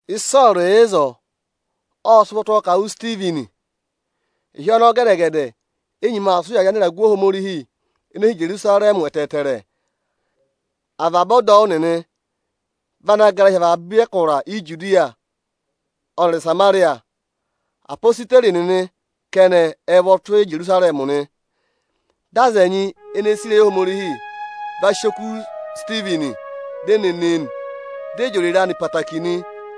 Ịsọọrụ yà ịzọọ, ộ sị ụvọ tụ́ ọọ ka à wụ Isitivini. Ịhị ọnọọ gẹdẹ-gẹdẹ, ê nyima aa sị ụyaa rị anịragụ Ohomorihi ene hi Ijerusarẹmị ẹtẹẹtẹrẹ. Avaba ọdọwụ nịnị vị ana gara hi avaba ẹkụra Ijudiya ọnịrị Ịsamarịya. Apositeri nịnị kẹnẹ ẹ vọ tụ́ Ijerusarẹmị nị. Dị aza ẹnyị ene sì ịrẹyị Ohomorihi va sị oku Isitivini, di e ne ne e nị, di e jị òrèrè anị ẹtẹẹtẹrẹ nị.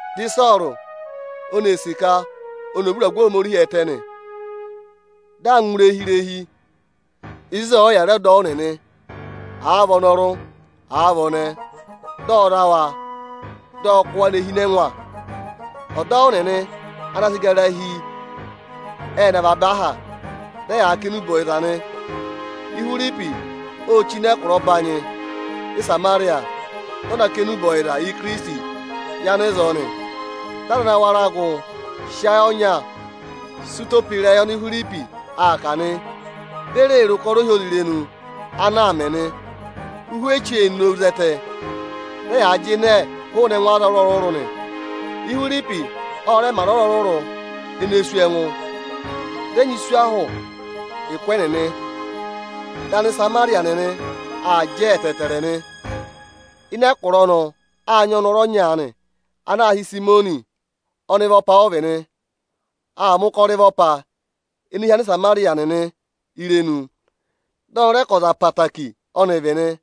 Dị Ịsọọrụ oni ee sì ka oni ò vú ịragụ Ohomorihi ẹtẹ nị. Dị aa ngụ irehi-irehii zị, ịzị ọ̀ọ yà re ọdọwụ nịnị, àa vị ọnọrụ, àa vị ọnẹẹ, dị ọ za wa, dị ọ kụ́ wa ne hi ịnị ẹngwa. Ọdọwụ nịnị ana gara hi, ệ nọ avaba aha, dị ẹyaa kà enube ọyịza nị. Ihwiripi ô chí nọ ẹkụra ọbanyị Ịsamarịya, dị ọ na kà enube ọyịza Ikirisiti yị anịzọọ nị. Dị aza ana wara gụ sị ayị ọnya sị ụtọ pe ịrẹyị oni Ihwiripi aa kà nị, di e re re ụkọrọ ohyozirenu ana aa mẹ nị. Ụhwẹ echu ê nowu zẹtẹ, dị ẹyaa jịnẹẹ hụụnị ẹngụ aza ọrụrụ-ọrụrụ nị. Ihwiripi ọ rẹ mẹ aza ọrụrụ-ọrụrụ ene sú ẹngụ, dị ẹnyị sú ahụ ụkụ ẹnịnị. Dị Anịsamarịya nịnị aa jẹ ẹtẹẹtẹrẹ nị. Ịnị ẹkụra ọnọọ â nyị ọnọrụ ọnya aanị, ana aā hị́ Ịsayịmọnị. Ọnịvọpa ọ vị nị. Aa mẹ̀ ụkọrọ ịvọpa ene hí Anịsamarịya nịnị irenu. Dị ọnị rẹ ka ọza ọkụmị-ọkụmị ọ́nị vị nị.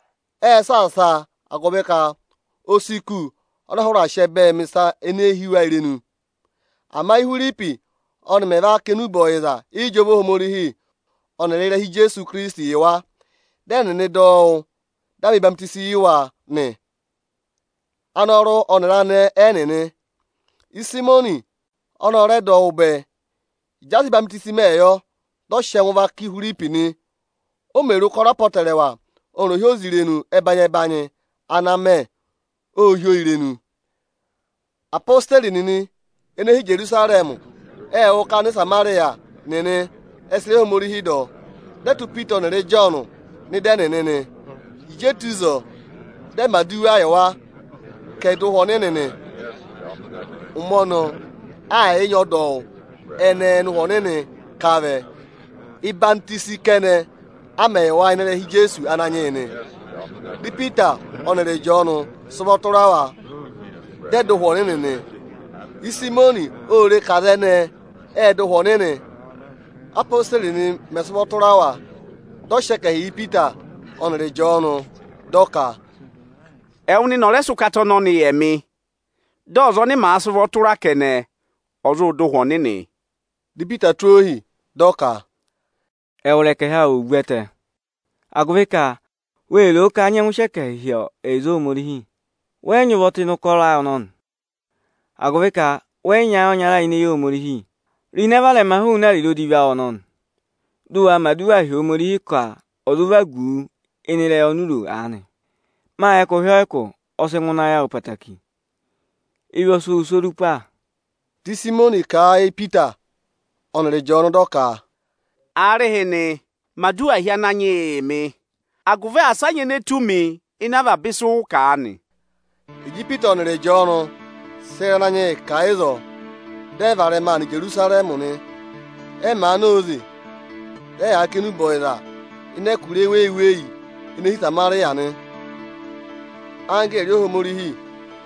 Ệ saasa a, agụvị ka o si kù ọnọọ hụrẹ aa sị ẹbẹẹ mẹ̀ ịsa ene hí wa irenu. Ama Íhwiripi ọnị mẹ̀ va kà enube ọyịza ịjọva Ohomorihi ọnịrị ịrẹha Ijeesu Ikirisiti yị wa, dị ẹnịnị dọ wụ́, â mẹ̀ ọyịhwọzenyi yị wa, anọrụ ọnịrị anẹẹ ẹnịnị. Ịsayịmọnị ọnị ọ rẹ dọ wụ́ bẹẹ. Ịjị a sị ọyịhwenyi mẹ yọ, dị ọ sị ẹngụ vaka Ihwiripi nị. O mè re ụkọrọ apọtẹrẹwa ọnịrị ohyozirenu ẹbanyị-ẹbanyị ana aa mẹ, ô hí oo irenu. Apositeri nịnị ene hi Ijerusarẹmị ệ wụ́ ka Anịsamarịya nịnị ẹ sị ịrẹyị Ohomorihi dọ, dị ẹ tụ́ Ipita ọnịrị Ịjọọnụ nọ ịdị ẹnịnị nị. Ịjị e tù ịzọọ, dị ẹ mẹ̀ aduwa yị wa, ka ẹ̀ dọ Ụhwẹ Ọnịnị nị. Ụmẹ ọnọọ, aà yị nyị ọdọwụ ẹnẹẹ ọnị Ụhwẹ Ọnịnị ká vẹ. Ọyịhwenyi ẹdọwụ kẹnẹ a mẹ yị wa ịnị ịrẹha Ijeesu Ananyị yị nị. Dị Ipita ọnịrị Ịjọọnụ sị ụvọ tụra wa, dị ẹ dọ Ụhwẹ Ọnịnị nị. Ịsayịmọnị ô re ka aza ẹnẹẹ ệ dọ Ụhwẹ Ọnịnị, ápositeri nịnị mẹ̀ sị ụvọ tụra wa. Dị ọ sị ẹkẹhị yị Ipita ọnịrị Ịjọọnụ dị ọ ka, “Ẹwụ nịnị ọ̀ rẹ sị ụkata ọnọnị yị ẹmị, dị ọza ọnị màa sị ụvọ tụra kẹnẹ, ọ̀ zụ dọ Ụhwẹ Ọnịnị!” Dị Ipita tụ́ ọọ ohi, dị ọ ka, “Ẹwụrị ẹkẹhị awụ ò vu ẹtẹ, agụvị ka wê ro o ka a nyẹngụ sị ẹkẹhị hị́ ẹyịza Ohomorihi. Wẹ yị nyị ụvọ tụ́ ịnị ụkọrọ ayị ọnọnị, agụvị ka wẹ yị nyị ayị ọnya ini eyi Ohomorihi. Ro ịnẹ varẹma hụụnị ariro odivi awụ ọnọnị, dụ wa mẹ̀ aduwa hi Ohomorihi ka ọ̀ọ zụ vagu wu ịnị ịrẹyị oni u ro aanị! Mâ yẹ ka ụhị ọyịkụ ọ sị ngụ ịnị ayị awụ ẹtẹẹtẹrẹ, ịvị ọ sị wụ sụ́ orupa.” Di Ịsayịmọnị kà a yị Ipita ọnịrị Ịjọọnụ dị ọ ka, “Aarịhịnị, mẹ̀ aduwa hi Ananyị yị yị mị, agụvị asị a nyị ene tù mi ịnị avaba ịsị ụ kà aanị!” Ịjị Ipita ọnịrị Ịjọọnụ sị ịrẹyị Ananyị yị kà ịzọọ, dị ẹ varẹma aa nọ Ijerusarẹmị nị. Ẹ màa na óze, dị ẹyaa kà enube ọyịza ịnị ẹkụra eweyi-eweyi ene hi Ịsamarịya nị. Anggẹẹrị Ohomorihi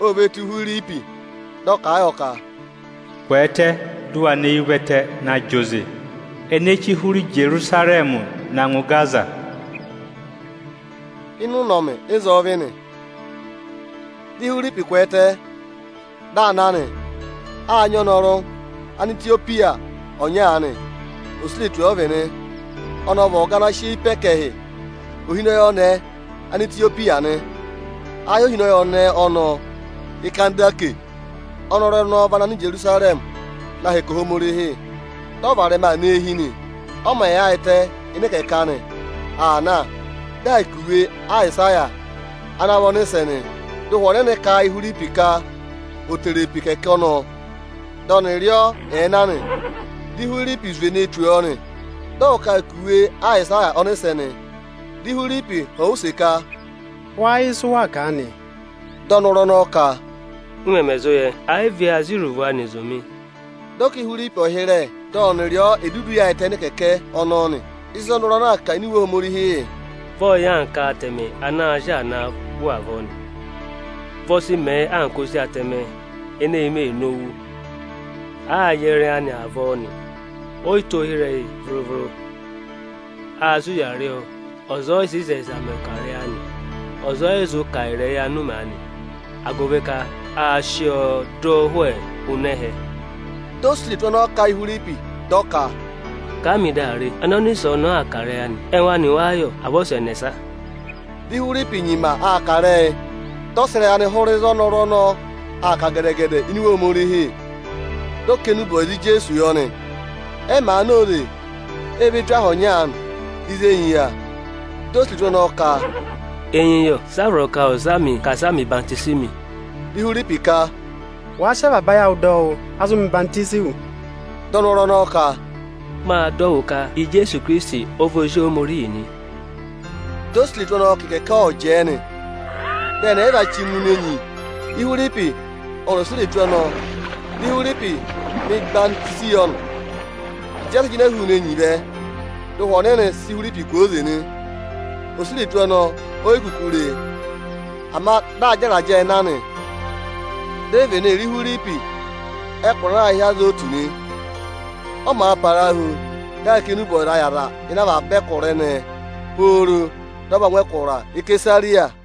o ve tù Ihwiripi, dị ọ kà a yọ ka, “Kwẹẹtẹ, dị ụ wa nọ eyi ụvẹtẹ na zị oze ene chí hụrẹ Ijerusarẹmị na ngụ Igaza!” Ịnị ụnọmị ịzọọ vị nị. Dị Ihwiripi kwẹẹtẹ, dị aa na nị. Â nyị ọnọrụ Anetiyopiya ọnya aanị, osuretu ọ vị nị. Ọnị ọ vị ọga ana sị eyi pe ẹkẹhị Ohinọyị ọnẹẹ Anetiyopiya nị. Aā hị́ ọnẹẹ ohinọyị ọnọọ Ikandase. Ọnọrụ ọnọọ vị ana nọ Ijerusarẹmị na hẹkẹ Ohomorihi, dị ọ varẹma aa nọ eehi nị. Ọ mẹ̀ yaayịtẹ ịnị ịkẹkẹ aanị aa na, dị aa kà iwe Ayịsaya ana vị ọnịsẹ nị. Dị Ụhwẹ Ọnịnị kà a yị Ihwiripi ka ò tere pe ịkẹkẹ ọnọọ, dị ọnị rị ọọ ẹ̀ẹ na nị. Dị Ihwiripi zwe ne tù ọ nị, dị ọ wú ka aa kà iwe Ayịsaya ọnịsẹ nị. Dị Ihwiripi họ̀ ọ use ka, “Wáá yẹ ịsị ụ waa kà aanị?” Dị ọnọrụ ọnọọ ka, “M mẹmẹ zụ yẹ, ẹ̀ yị vị a sị iruvo anị zụ̀ mị.” Dị ọ ka Ihwiripi ọ̀ hịrẹ, dị ọnị rị ọ è dudu yaayịtẹ ịnị ịkẹkẹ ọnọọ nị. Ịzị ọnọrụ ọnọọ aa kà ini Iwe Ohomorihi yị: “Vị ọ yà anka atẹmẹ ana a sị aa naa wụ avọọ nị. Vị ọ sị mẹẹ anka ozi atẹmẹ ene è yi mē nowu, àa yẹrẹ ẹyị anị avọọ nị, o yi tụ́ ohi ịrẹyị vụrụ-vụrụ. Â sị ụya rị ọọ, ọza ọ yị sị ịzẹyịza mẹ̀ ọkarẹyị anị. Ọza ọ yị zụ kà ịrẹyị anụmẹ anị, agụvị ka a sị ọọ dọ ụhwẹ hụụnị ẹhẹ.” Di osuretu ọnọọ kà a yị Ihwiripi dị ọ ka, “Kà a mị dị a re, ẹnẹ ọnịsẹ ọnọọ aa kà ịrẹyị anị? Ẹngụ anị wáá yọ, à vị ọza ẹnẹsa?” Dị Ihwiripi nyima aa kà ịrẹyị, dị ọ sị ịrẹyị anị hụrẹ ịzị ọnọrụ ọnọọ aa kà gẹdẹ-gẹdẹ ini Iwe Ohomorihi, dị ọ kà enube ọyịza Ijeesu yọ nị. Ẹ màa na óze, e ve tù aha ọnya aanị, ịzị enyi yà. Di osuretu ọnọọ ka, “Enyi yọ, sị a vọrọ ka ọ̀ za mị ka asị a mẹ̀ ọyịhwọzenyi mị?” [Dị Ihwiripi ka, “Wàa sị avaba ayị awụ dọ wụ́, a zụ mẹ̀ ọyịhwọzenyi wụ.” Dị ọnọrụ ọnọọ ka, “Mâ dọ wụ́ ka Ijeesu Ikirisiti ọ vị Ozi Ohomorihi nị.”] Di osuretu ọnọọ ka ịkẹkẹ ọ̀ọ jẹẹ nị. Dị ẹnị ẹyịva chí ngụ ịnịnẹ enyi, Ihwiripi ọnịrị osuretu ọnọọ; di Ihwiripi mẹ̀ ọyịhwọzenyi yọ nị. Ịjị ẹ sị jịnẹ hụụnị enyi vẹ, dị Ụhwẹ Ọnịnị sị Ihwiripi kwooze nị. Osuretu ọnọọ o yi kuku re e, ama dị aa jẹ ịrajẹẹ na nị. Di e vene re Ihwiripi ẹkụra ana aā hị́ Azotu nị. Ọ́ màa parahu, dị aa kà enube ọyịzaa yị aza ịnị avaba ẹkụra ẹnẹẹ pooro dị ọ va ngụ ẹkụra Isesariya nị.